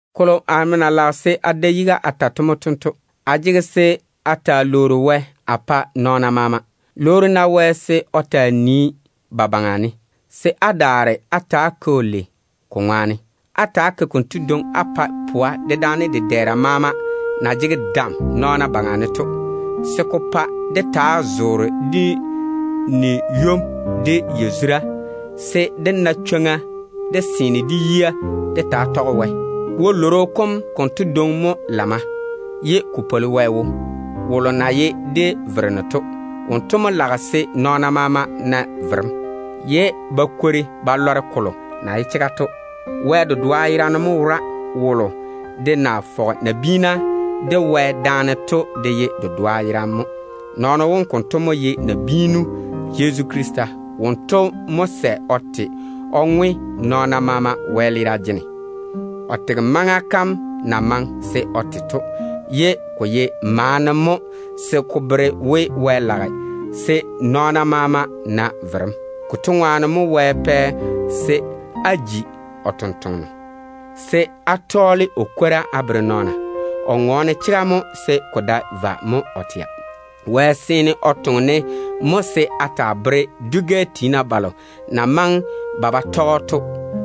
Kolo amo na lage se a da yiga a ta mo tento. Á jege se á ta‑á lwoori Wɛ á pa nɔɔna maama. Lwoori-na Wɛ se o taa nii ba baŋa ne, se á daare á ta‑á ke‑o lei ko ŋwaane. Ta‑á ke-na konto dwoŋi á pae pwa, dedaane dedɛɛra maama na jege dam nɔɔna baŋa ne to, se ko pa dé taa zoore de ni-ywom de yazura, se dé na chwoŋa dé seene dé yia dé taa tɔge Wɛ. Wɛ-lworo kom konto dwoŋi mo lamma, ye ko pwoli Wɛ wo, wolo na ye dé Vereno to. Wonto mo lage se nɔɔna maama na verem, se ba kwori ba taa yei o chega kam. Wɛ dedoa yerane mo wora. Wolo de na fɔge nabiina de Wɛ daane to de ye dedoa yerane mo. Kotu nam mo ye nabiinu Yezu Krista. Wonto mo sɛ o te o ma ŋwe nɔɔna maama wɛleera jene. O tege maŋa kam na maŋe se o te to, se ko taa ye maana mo ko bere Wɛ zaane dem na ye tei to. Konto ŋwaane mo Wɛ pɛ se a ji o totoŋa nakwe, se a taa tɔɔle o kwora a bere nɔɔna. A ŋɔɔne chega mo se ko dae vwa. Wɛ seene o toŋe-ne mo se a taa tɛ o chega kam a bere dwi-gɛ tiina balo na maŋe ba ba tɔge‑o to.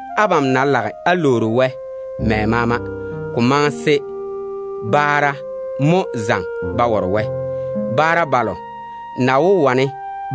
Abam ná lage á lwoori Wɛ mɛ maama, ko maŋe se baara mo zaŋe ba ware Wɛ, ne ko ná ye baara balo na wó wane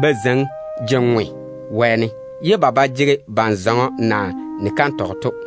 ba zeiŋi je-ŋwe wɛɛne, ye ba ba jege ban-zɔŋɔ naa ni-kantɔgɔ to.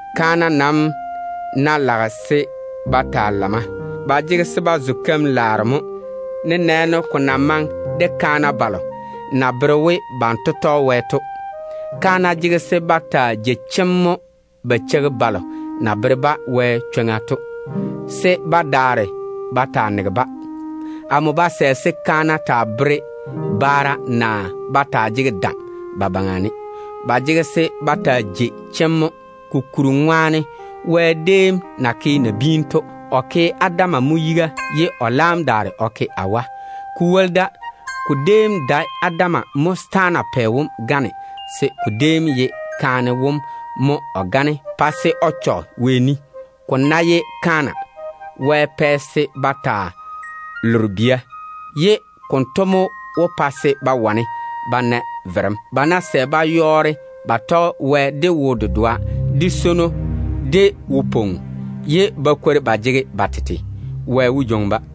Kaana nam ná lage se ba taa lamma, ba jege se ba zo keim-laaro mo, nenɛɛne ko na maŋe de kaana balo na bere we banto tɔge Wɛ to. Kaana jege se ba taa jei chemm mo ba cheigi balo na bere-ba Wɛ chwoŋa to, se ba daare ba taa nege-ba. Amo ba sɛ se kaana taa bere baara, naa ba taa jege dam ba baŋa ne. Ba jege se ba taa jei chemm mo. Kokuri ŋwaane, Wɛ déem na ke nabiina to, o ke Adam mo yiga ye o laam daare o ke Awa. Ko woli da, ko déem dae Adam mo setaana pɛ wom gane, se ko déem ye kaane wom mo o gane pa se o chɔge Wɛ ni. Ko ná ye kaana, Wɛ pɛ se ba taa lore bia, ye konto mo wó pa se ba wane ba na verem. Ba ná sɛ ba yɔɔre ba tɔge Wɛ de wo-dedoa, de swono, de wo-pwoŋo, ye ba kwori ba jege ba tete, Wɛ wó jwoŋi-ba.